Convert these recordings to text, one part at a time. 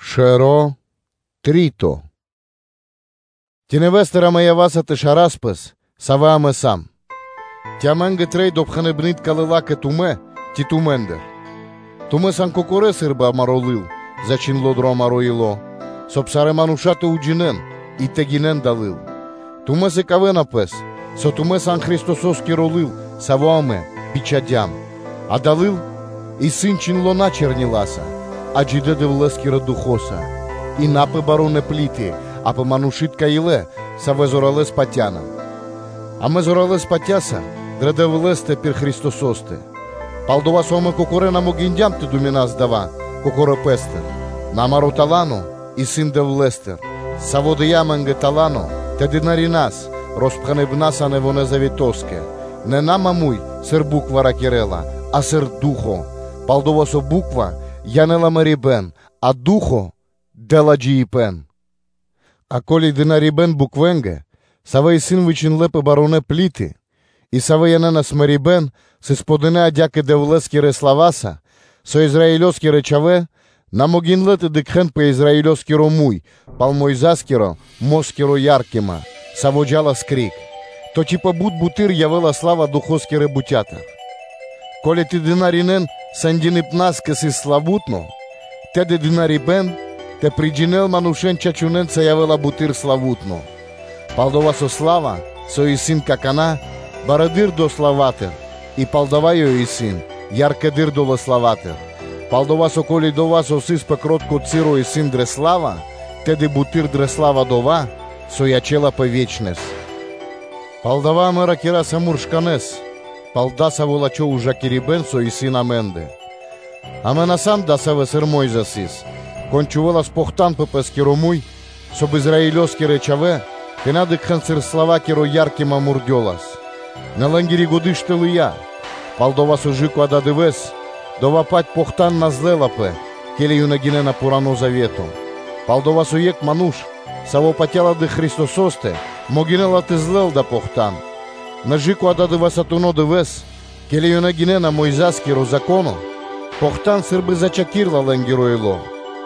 Нэвонэ́-Завето́скирэ Дына́рья (Служы́тели) Ци нэвэ́стыр амэ ява́са тэ шарас пэс, савэ́ амэ сам? Ци амэ́нгэ трэй допхэныбны́тка (рекоменды́тка) лыла́ кэ тумэ́ ци тумэ́ндыр? Тумэ́ сан кокорэ́ сы́рбы амаро́ лыл, зачхиндло́ дро амаро́ ило́, соб (кай) сарэ́ мануша́ тэ уджинэ́н и тэ гинэн дава́ лыл; тумэ́ сыкавэ́на пэс, со тумэ́ сан Христосо́скиро лыл, саво́ амэ бичхадям; дава́ лыл исын чхиндло́ на чэрниласа, а Джидэ́ Дэвлэскирэса Духо́са, и на пэ барунэ́ плиты, а пэ манушы́тка илэ, дрэ савэ́ амэ зоралэ́с патя́са. Амэ зоралэ́с патя́са дрэ Дэвлэ́стэ пир Христосо́стэ: пал-дова́ со амэ кокорэ́ на могиндям тэ думинас дава́ кокорэ́ пэ́стыр, нэ амаро́ тала́но исын Дэвлэ́стыр; Саво́ дыя́ амэ́нгэ тала́но тэ служынас (тэ дынарина́с) роспхэныбна́са Нэвонэ́ Завето́скэ, нэ на маму́й (прямэс), сыр буква ракирэ́ла, а сыр Ду́хо (Фа́но); пал-дова́ со буква Законо́стыр янэ́ла мэрибэ́н, а Ду́хо (Фа́но) дэ́ла джиибэ́н. А ко́ли тэ дынаринэ́н (тэ служынэ́н) буквэ́нгэ, савэ́ сыс вычхиндлэ́ пэ барунэ́ плиты, и савэ́ янэ́нас мэрибэ́н, сыс подынэ адя́кэ Дэвлэ́скирэ слава́са, со Израилёскирэ чхавэ́ на могиндлэ́ тэ дыкхэ́н пэ Израилёскиро муй пал Мойза́скирэ-москири яркима, саво́ джа́лас кэ ко́нцо (кэ яго́ро), то ци пэ бут буты́р явэ́ла сла́ва Духо́скирэ бутя́тыр! Ко́ли тэ дынаринэ́н скэдыибна́скэ сыс славу́тно, тэды дынарибэ́н (служэниё) тэ приджинэл манушэ́н чачунэнца явэ́ла буты́р славу́тно. Пал-дова́ со сла́ва, со исын какана́, барэды́р долэ́ славатыр и палдава́ ёй исын яркэдыр долэ́ славатыр. Пал-дова́ со, ко́ли дова́, со сыс пэ кротко часо, исын дрэ сла́ва, тэды буты́р дрэ сла́ва дова́, со ячэ́лапэ ве́чнэс. Палдава́ амэ ракираса муршканэ́с пал дасаво лачхо́ ужакирибэ́н, со исын амэ́ндэ: амэ на сам дасавэ́ сыр Мо́йза сыс, кон учхакирдя́ пэ́скиро муй, соб (кай) Израилёскирэ чхавэ́ тэ на дыкхэ́н сыр слава́кири я́ркима мурдёлас. Нэ лэ́нгири годы́ штылыя, пал-дова́ со кэ ададывэ́с дова́-паць похтан на злэлапэ, ке́ли ёнэ гинэ́на Пхурано́ Завето, пал-дова́ со екх ману́ш, саво́ патя́ла дрэ Христосо́стэ, могинэ́ла тэ злэл дава́ похтан. Нэ кэ/жы́ко ададывэсатуно дывэ́с, ке́ли ёнэ гинэ́на Мойза́скиро Зако́но, похтан сы́рбы зачхакирэла лэ́нгиро ило́.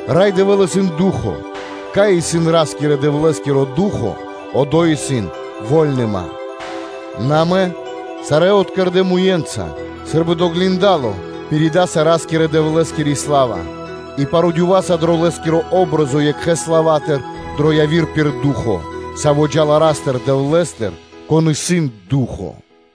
Рай Дэвэ́л исын Ду́хо (Фа́но). Кай исын Ра́скирэ-Дэвлэ́скиро Ду́хо (Фа́но), одо́й исын вольныма. Нэ амэ сарэ́ откэрдэ муе́нца сы́рбы дро гиндало (зеркало) пиридаса Ра́скирэ-Дэвлэ́скири сла́ва и парудёва́са дрэ Лэ́скири патри́н (о́бразо) екхэ́ слава́тыр дро яви́р пир Ду́хо (Фа́но), Саво́ джа́ла Ра́скирэ-Дэвлэ́скирэ, Духо́стыр.